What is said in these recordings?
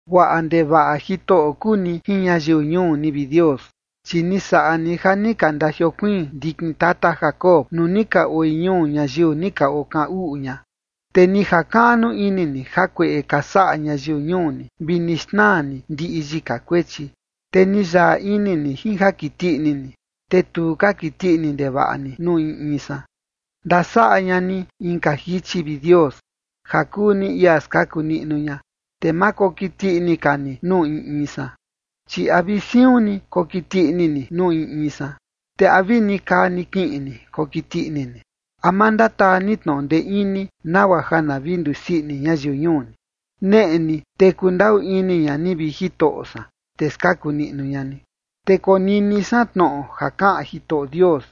Guaꞌa ndevaꞌa Jitoꞌo kuu ni jin ñayiu ñuu ni, vi Dios, chi ni saꞌa ni ja ni ka ndajiokuiin ndikin tata Jacob nuu ni ka oi ñuu ñayiu ni ka kaꞌan uꞌu ña. Te ni jakaꞌnu ini ni jakueꞌe ka saꞌa ñayiu ñuu ni, vi ni xnaa ni ndiꞌi yika kuechi. Te ni yaꞌa ini ni jin ja kiti ini ni, te tu ka kiti ini ndevaꞌa ni nuu in in san. Ndasaꞌa ña ni inka jichi, vi Dios, ja kuu ni ia skaku niꞌnu ña, te ma kokiti ini ka ni nuu in in san. Chi ¿a vi siun ni kokiti ini ni nuu in in san? ¿Te a vi nikaa nikiꞌin ni kokiti ini ni? ¿A ma ndataa ni tnoꞌo ndee ini, nagua ja na vi ndusii ini ñayiu ñuu ni? Neꞌe ni, te kundaꞌu ini ña ni, vi Jitoꞌo san, te skaku niꞌnu ña ni. Te konini san tnoꞌo ja kaꞌan Jitoꞌo Dios,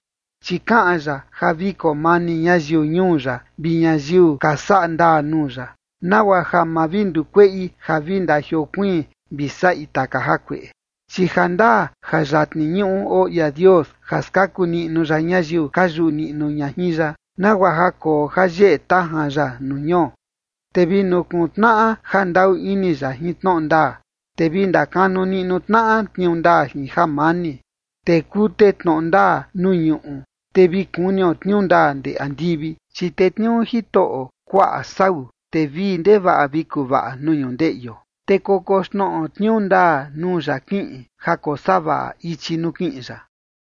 chi kaꞌan ya ja vi koo mani ñayiu ñuu ya vi ñayiu ka saꞌa ndaa nuu ya, nagua ja ma vi ndukueꞌi ja vi ndajiokuiin vi saꞌi taka jakueꞌe. Chi jandaa ja yatni ñuꞌu oo ia Dios ja skaku niꞌnu ya ñayiu ka yuꞌu niꞌnu ña jin ya, nagua ja koo ja yeꞌe tajan ya nuu ñuo. Te vi nukuntnaꞌa ja ndaꞌu ini ya jin tnoꞌo ndaa, te vi ndakanu niꞌnu tnaꞌa tniuu ndaa jin jamani. Te kute tnoꞌo ndaa nuu ñuꞌu, te vi kunio tniuu ndaa ndee andivi. Chi tetniuu Jitoꞌo kuaꞌa sau, te vii ndevaꞌa vi kuvaꞌa nuu ñundeꞌio. Te kokoxnoꞌo tniuu ndaa nuu ya kiꞌin ja kosavaꞌa ichi nuu kiꞌin ya.